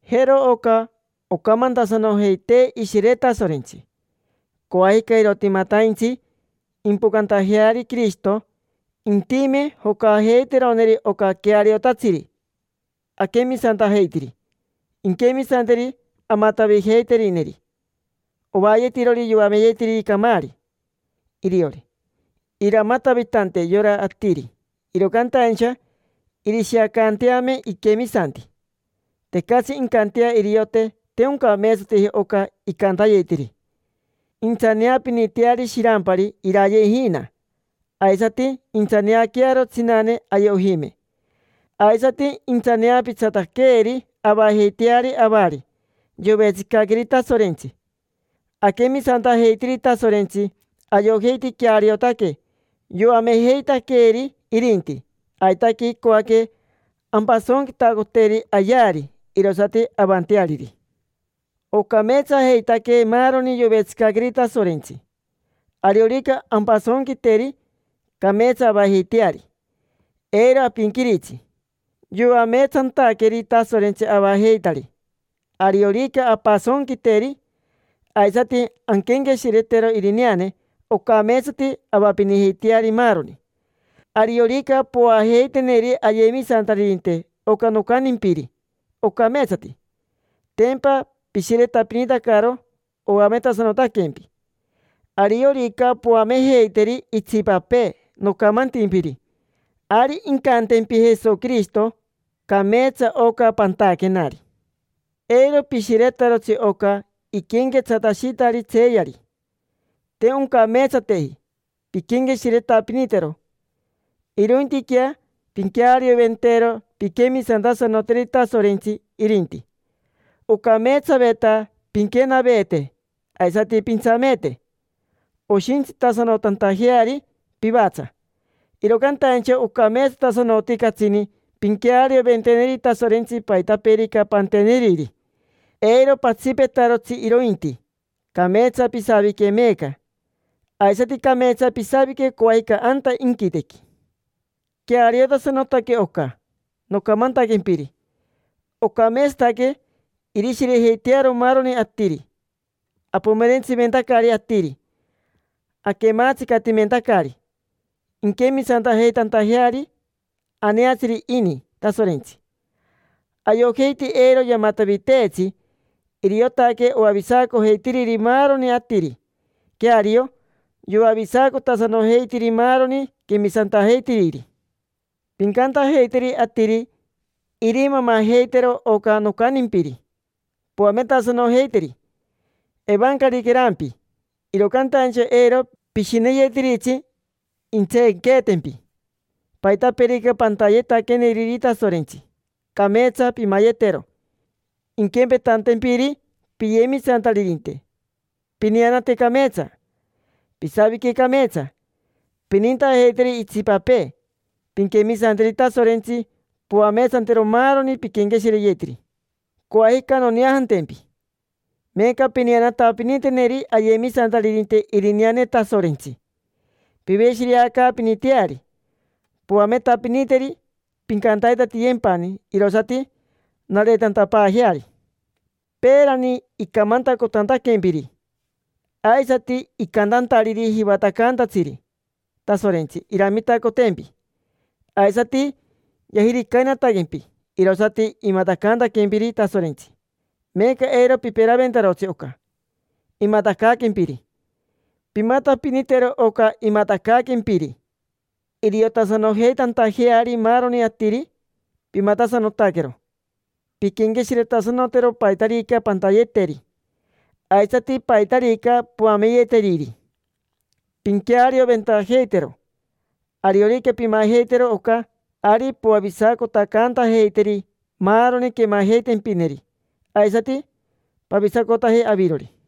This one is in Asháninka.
Jero oca ocamantasanojeitee Ishire Tasorentsi. Coajica, irotimataintsi impocantajeari Quirishito, intime jocajeiteroneri oca queariotatsiri aquemisantajeitiri. Inquemisanteri amatavijeiterineri, ovaayetirori yoameyetiriri camaari iriori. Iramatavitante yora atiri, iro cantaincha irishiacanteame iquemisanti. Tecatsi incantea iriote te oncameetsateji oca icantayetiri. Intsaneapiniteari shirampari iraye ijina, aisati intsaneaquearo tsinane aye ojime. Aisati intsaneapitsataqueeri avajeiteari avari yovetsicaqueeri Tasorentsi. Aquemisantajeitiri Tasorentsi, ayojeiti queariotaque yoamejeitaqueeri irinti. Aitaque icoaque ampasonquitacoteri ayeari, irosati avanteariri. Ocameetsajeitaque maaroni yovetsicaqueri Tasorentsi. Ariorica ampasonquiteri, cameetsa avajeiteari, eiro apinquiritsi. Yoameetsantaqueeri Tasorentsi avajeitari. Ariorica ampasonquiteri, aisati anquenqueshiretero irineane, ocameetsati avapinijeiteari maaroni. Ariorica povaajeiteneri ayemisantaririnte oca nocantimpiri, ocameetsati. Tempa pishiretapinitacaro, oametasanotaquempi. Ariorica poamejeiteri itsipapee nocamantimpiri, ari incantempi Jesoquirishito: “Cameetsa oca pantaquenari”. Eiro pishiretarotsi oca iquenquetsatashitari tseeyari: te oncameetsateji pinquenqueshiretapinitero. Irointiquea pinquearioventero pinquemisantasanoteri Tasorentsi, irinti. Ocameetsaveta pinquenaveete aisati pintsameete, oshintsitasanotantajeari pivatsa; iro cantaincha ocameetsatasanoti catsini pinquearioventeneri Tasorentsi paitapeerica panteneriri. Eiro patsipetarotsi irointi: cameetsa pisavique meeca, aisati cameetsa pisavique coajica anta inquitequi. Queariotasanotaque oca nocamantaquempiri. Ocameetsataque irishirejeitearo maaroni atiri. Apomerentsiventacari atiri, aquematsicatimentacari inquemisantajeitantajeari. Aneatsiri ini Tasorentsi, ayojeiti eiro yamataviteetsi: iriotaque oavisacojeitiriri maaroni atiri. Queario, yoavisacotasanojeitiri maaroni quemisantajeitiriri. Pincantajeiteri atiri irimamajeitero oca nocantimpiri, poametasanojeiteri. Evancariquerampi, iro cantaincha eiro pishineyetiritsi intseenqueetempi. Paitapeerica pantayetaqueneriri Tasorentsi, cameetsa pimayetero, inquempetantempiri piyemisantaririnte: pineanate cameetsa, pisavique cameetsa, pinintajeiteri itsipapee, pinquemisanteri Tasorentsi, poameetsantero maaroni pinquenqueshireyeteri. Coajica noneajantempi. Meeca pineanatapiniteneri ayemisantaririnte irineane Tasorentsi, piveshireacaapiniteari, poametapiniteri. Pincantatiyempani, irosati nareetantapaajeari. Peerani icamantacotantaquempiri, aisati icantantariri jivatacaantatsiri Tasorentsi iramitacotempi, aisati yajiricainataquempi, irosati imatacaantaquempiri Tasorentsi. Meeca eiro piperaventarotsi oca imatacaaquempiri. Pimatapinitero oca imatacaaquempiri, iriotasanojeitantajeari maaroni atiri pimatasanotaquero. Pinquenqueshiretasanotero paitarica pantayeteri, aisati paitarica poameyeteriri: pinquearioventajeitero. Ariorica pimajeitero oca, ari poavisacotacantajeiteri maaroni quemajeitempineri, aisati pavisacotaje avirori.